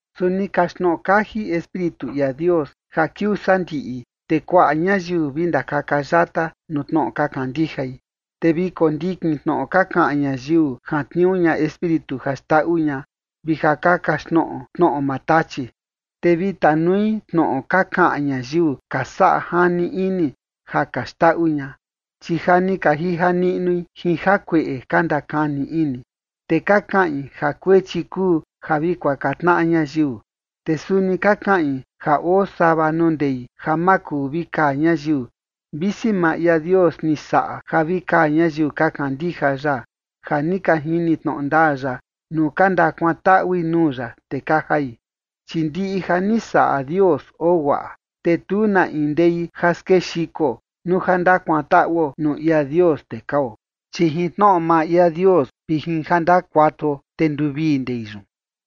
Su ni kaxtnoꞌo kaji Espíritu ia Dios ja kiuu sandiꞌi, te kuaꞌa ñayiu vi ndakaka yata nuu tnoꞌo ka kandijai, te vi kondikin tnoꞌo ka kaꞌan ñayiu jantniuu ña espíritu ja xndaꞌu ña, vi ja ka kaxtnoꞌo tnoꞌo maa Tachi. Te vi tanui tnoꞌo ka kaꞌan ñayiu ka saꞌa jani ini ja ka xndaꞌu ña, chi ja ni ka jija niꞌnui jin jakueꞌe ka ndakani ini. Te ka kaꞌin ja kuechi kuu ja vi kuaka tnaꞌa ñayiu. Te suni ka kaꞌin ja oo sava nuu ndei ja ma kuu vi kaa ñayiu, visi maa ia Dios ni saꞌa ja vi kaa ñayiu ka kandija ya ja ni ka jini tnoꞌo ndaa ya, nuu ka ndakuantaꞌui nuu ya, te ka jai. Chi ndiꞌi ja ni saꞌa Dios oo guaꞌa, te tu na in ndei ja skexiko nuu ja ndakuantaꞌuo nuu ia Dios, te kao. Chi jin tnoꞌo maa ia Dios vi jin ja ndakuatuo, te nduvii ndei yun.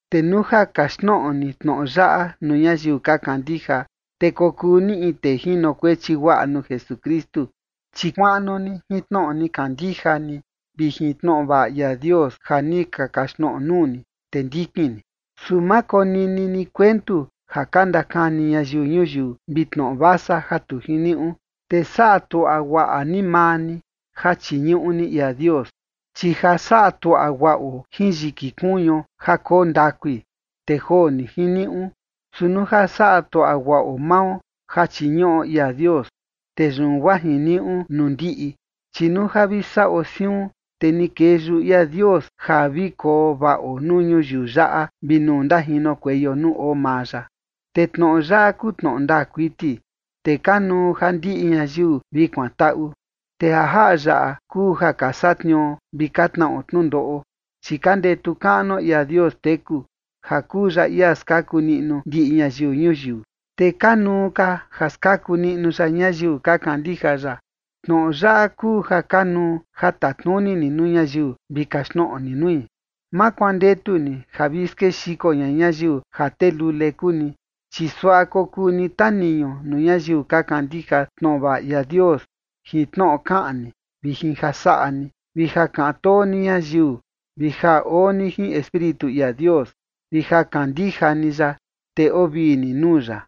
Te nuu ja kaxtnoꞌo ni tnoꞌo yaꞌa nuu ñayiu ka kandija, te kokuu ni in tee jinokuechi guaꞌa nuu Jesukristu, chi kuaꞌnu ni jin tnoꞌo ni kandija ni vi jin tnoꞌo vaꞌa ia Dios ja ni ka kaxtnoꞌo nuu ni, te ndikin ni. Su ma konini ni kuentu ja ka ndakani ñayiu ñuyiu vi tnoꞌo vasa ja tu jiniuꞌu, te saꞌa tuaꞌa guaꞌa ni maa ni ja chiñuꞌu ni ia Dios. Chi ja saꞌa tuaꞌa guaꞌo jin yiki kuñuo ja koo ndakui, te joo ni jiniuꞌu. Su nuu ja saꞌa tuaꞌa guaꞌo mao ja chiñuꞌo ia Dios, te yun guaa jiniuꞌu nuu ndiꞌi. Chi nuu ja vi saꞌo siun, te ni kee yuꞌu ia Dios ja vi koo vaꞌo nuu ñuyiu yaꞌa vi nuu ndajinokueio nuu oo maa ya. Te tnoꞌo yaꞌa kuu tnoꞌo ndaa kuiti, te kanuu ja ndiꞌi ñayiu vi kuantaꞌu. Te ja jaꞌa yaꞌa kuu ja ka satniuo vi ka tnaꞌo tnundoꞌo, chi ka ndetu kaꞌnuo ia Dios teku ja kuu ya ia skaku niꞌnu ndiꞌi ñayiu ñuyiu, te kanuu ka ja skaku niꞌnu ya ñayiu ka kandija ya. Tnoꞌo yaꞌa kuu ja kanuu ja tatnuni ni nuu ñayiu vi kaxtnoꞌo ni nui. Ma kuandetu ni ja vi skexiko ña ñayiu ja tee lule kuu ni, chi suaꞌa kokuu ni taniñu nuu ñayiu ka kandija tnoꞌo vaꞌa ia Dios jin tnoꞌo kaꞌan ni vi jin ja saꞌa ni vi ja kaꞌan too ni ñayiu [vi ja oo ni jin Espíritu ia Dios] vi ja kandija ni ya, te oo vii ni nuu ya.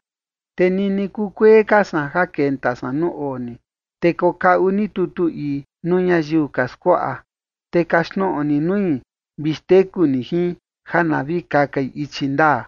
Te nini kukuee ka san ja kenta san nuu oo ni, te kokaꞌu ni tutu ii nuu ñayiu ka skuaꞌa, te kaxtnoꞌo ni nui vi xteku ni jin ja na vi kakai ichi ndaa.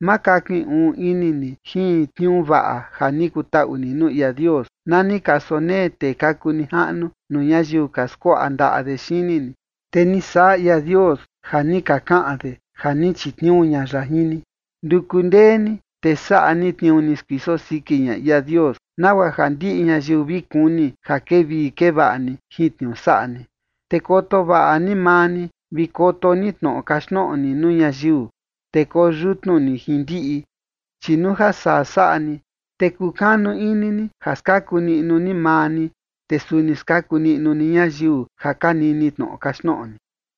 Ma kakin uun ini ni jin tniuu vaꞌa ja ni kutaꞌu ni nuu ia Dios na ni ka sonee tee ka kuu nijaꞌnu nuu ñayiu ka skuaꞌa ndaꞌa de xini ni, te ni saꞌa ia Dios ja ni ka kaꞌan de ja ni chitniuu ña ya jin ni. Nduku ndee ni, te saꞌa ni tniuu ni skuiso siki ña ia Dios, nagua ja ndiꞌi ñayiu vi kuni ja kevii kevaꞌa ni jin tniuu saꞌa ni. Te koto vaꞌa ni maa ni, vi koto ni tnoꞌo kaxtnoꞌo ni nuu ñayiu, te koyutnu ni jin ndiꞌi, chi nuu ja saa saꞌa ni, te kukanu ini ni ja skaku niꞌnu ni maa ni, te suni skaku niꞌnu ni ñayiu ja ka nini tnoꞌo kaxtnoꞌo ni.